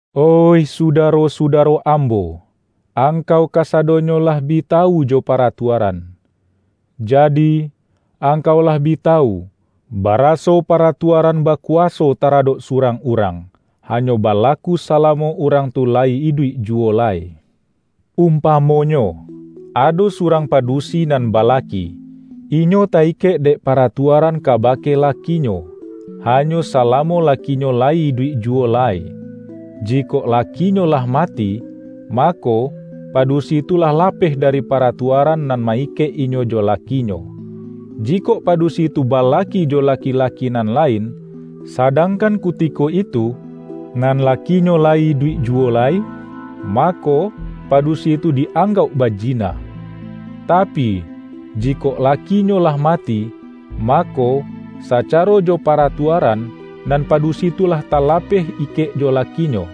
Oih sudaro-sudaro ambo! Angkau kasadonyo lah bi tawu jo paratuaran. Jadi, angkau lah bi tawu, baraso paratuaran bakuwaso taradok surang urang, hanyo balaku salamo urang tu layi iduik juwo lai. Umpamonyo, ado surang padusi nan balaki, inyo ta-ikek dek paratuaran kabake lakinyo, hanyo salamo lakinyo layi iduik juwo lai. Jikok lakinyo lah mati, mako, padusi tu lah lapeh dari paratuaran nan ma-ikek inyo jo lakinyo. Jikok padusi tu balaki jo laki-laki nan lain, sadangkan kutiko itu, nan lakinyo layi iduik juwo lai, mako, padusi tu di-anggauk bajina. Tapi, jikok lakinyo lah mati, mako, sacaro jo paratuaran, nan padusi tu lah talapeh ikek jo lakinyo.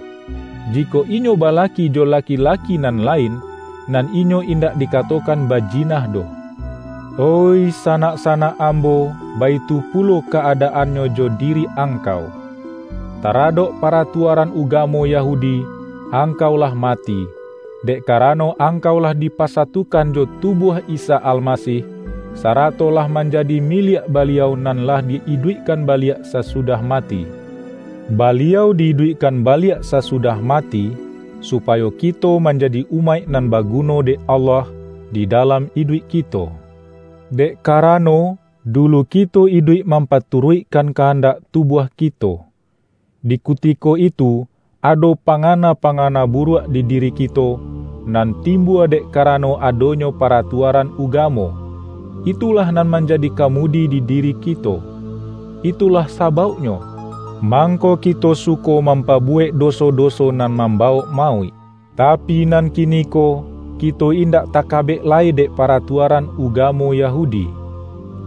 Jikok inyo balaki jo laki-laki nan lain, nan inyo indak dikatokan bajina doh. Oih sanak-sanak ambo, baitu pulo ka-adaannyo jo diri angkau. Taradok paratuaran ugamo Yahudi, angkau lah mati, dek karano angkau lah dipasatukan jo tubuah Isa Almasih, sarato lah manjadi miliak Baliau nan lah di-iduikkan baliak sasudah mati. Baliau di-iduikkan baliak sasudah mati, supayo kito manjadi umaik nan baguno dek Allah, di dalam iduik kito. Dek karano, dulu kito iduik mampaturuikkan kandak tubuah kito. Di kutiko itu ado pangana-pangana buruak di diri kito, nan timbua dek karano adonyo paratuaran ugamo, itulah nan manjadi kamudi di diri kito. Itulah sabauknyo, mangko kito suko mampabuwek doso-doso nan mambawok mauik. Tapi nan kiniko, kito indak takabek lai dek paratuaran ugamo Yahudi.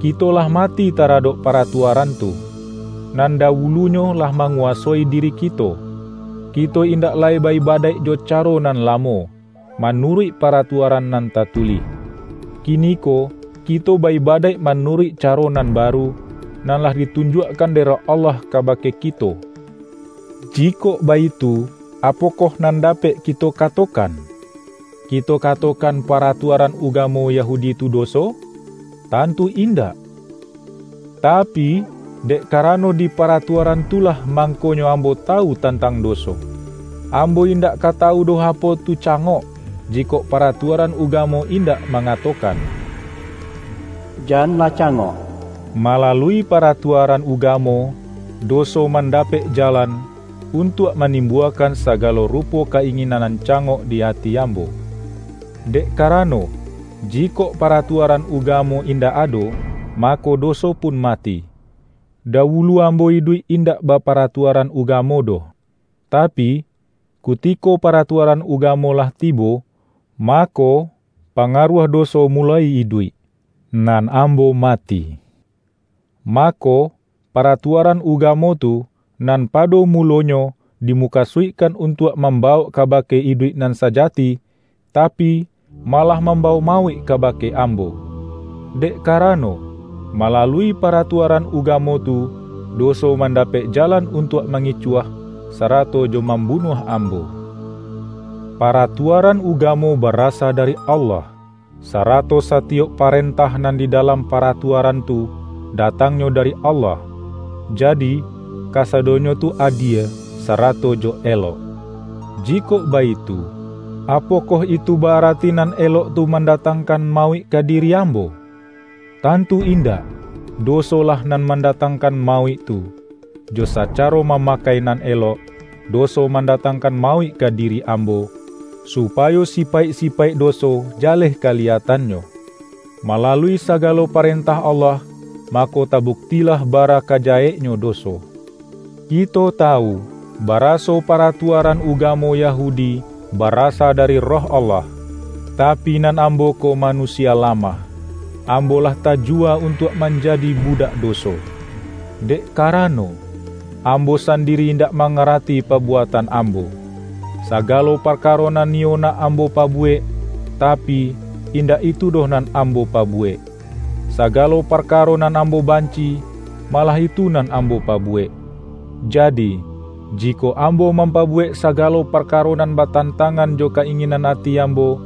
Kito lah mati taradok paratuaran tu, nan dawulunyo lah manguwasoi diri kito. Kito indak lai ba-ibadaik jo caro nan lamo, manuruik paratuaran nan tatulih. Kiniko kito ba-ibadaik manuruik caro nan baru, nan lah ditunjuakkan dek Roh Allah kabake kito. Jikok baitu, apokoh nan dapek kito katokan? Kito katokan paratuaran ugamo Yahudi tu doso? Tantu indak! Tapi, dek karano di paratuaran tu lah, mangkonyo ambo tawu tantang doso. Ambo indak ka tawu doh apo tu cangok, jikok paratuaran ugamo indak mangatokan,”Janlah cangok.” Malalui paratuaran ugamo, doso mandapek jalan, untuak manimbuakan sagalo rupo ka-inginan nan cangok di ati ambo; dek karano, jikok paratuaran ugamo indak ado, mako, doso pun mati. Dawulu ambo iduik indak baparatuaran ugamo doh. Tapi, kutiko paratuaran ugamo lah tibo, mako, pangaruah doso muloi iduik, nan ambo mati. Mako, paratuaran ugamo tu, nan pado mulonyo, dimukasuikkan untuak mambawok kabake iduik nan sajati, tapi, malah mambawok mauik kabake ambo. Dek karano, malalui paratuaran ugamo tu, doso mandapek jalan untuak mangicuah, sarato jo mambunuah ambo. Paratuaran ugamo barasa dari Allah, sarato satiyok parentah nan di dalam paratuaran tu, datangnyo dari Allah, jadi, kasadonyo tu adie, sarato jo elok. Jikok baitu, apokoh itu ba-arati nan elok tu mandatangkan mauik ka diri ambo? Tantu indak! Dosolah nan mandatangkan mauik tu. Jo sacaro mamakai nan elok, doso mandatangkan mauik ka diri ambo, supayo sipaik-sipaik doso jaleh kaliyatannyo. Malalui sagalo parentah Allah, mako tabuktilah bara ka jaheknyo doso. Kito tawu, baraso paratuaran ugamo Yahudi barasa dari Roh Allah; tapi nan ambo ko manusia lamah. Ambo lah tajuwa untuak manjadi budak doso. Dek karano, ambo sandiri indak mangarati pabuatan ambo. Sagalo parkaro nan niyo nak ambo pabuwek, tapi, indak itu doh nan ambo pabuwek; sagalo parkaro nan ambo banci-i, malah itu nan ambo pabuwek. Jadi, jikok ambo mampabuwek sagalo parkaro nan batantangan jo ka-inginan ati ambo,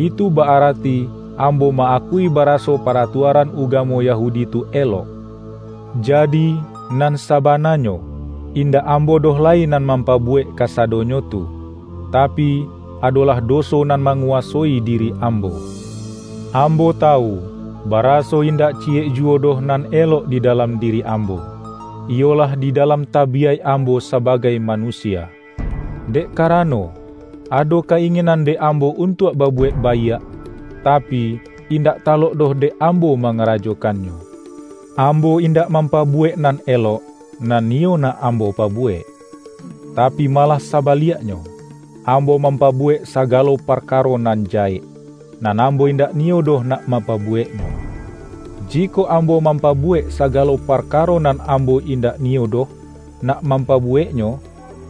itu ba-arati ambo ma-akui baraso paratuaran ugamo Yahudi tu elok. Jadi, nan sabananyo, indak ambo doh lai nan mampabuwek kasadonyo tu, tapi, adolah doso nan manguwasoi diri ambo. Ambo tawu, baraso indak ciyek juwo doh nan elok di dalam diri ambo; iyolah di dalam tabiyaik ambo sabagai manusia. Dek karano, ado ka-inginan dek ambo untuak babuwek baiak, tapi, indak talok doh dek ambo mangarajokannyo. Ambo indak mampabuwek nan elok, nan niyo nak ambo pabuwek; tapi, malah sabaliaknyo, ambo mampabuwek sagalo parkaro nan jahek, nan ambo indak niyo doh nak mampabuweknyo. Jikok ambo mampabuwek sagalo parkaro nan ambo indak niyo doh nak mampabuweknyo,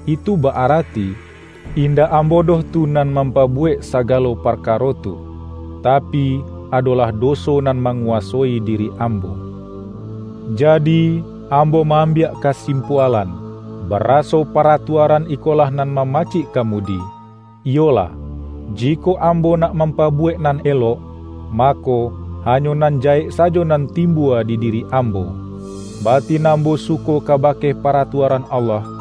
itu ba-arati, indak ambo doh tu nan mampabuwek sagalo parkaro tu, tapi, adolah doso nan manguwasoi diri ambo. Jadi, ambo ma-ambiak kasimpualan, baraso paratuaran ikolah nan mamacik kamudi: iyolah, jikok ambo nak mampabuwek nan elok, mako, hanyo nan jahek sajo nan timbua di diri ambo. Batin ambo suko kabake paratua-ran Allah,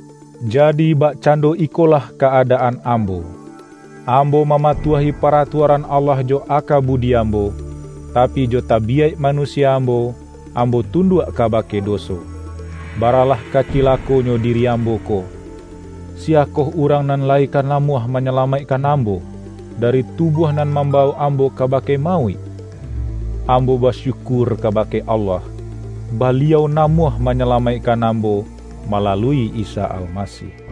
jadi, bakcando ikolah ka-adaan ambo: ambo mamatuahi paratuaran Allah jo aka budi ambo, tapi, jo tabiyaik manusia ambo, ambo tunduak kabake doso. Baralah ka cilakonyo diri ambo ko! Siyakoh urang nan lai ka namuah manyalamaikkan ambo, dari tubuah nan mambawok ambo kabake mauik? Ambo basyukur kabake Allah! Baliau namuah manyalamaikkan ambo malalui Isa Almasih. ROMA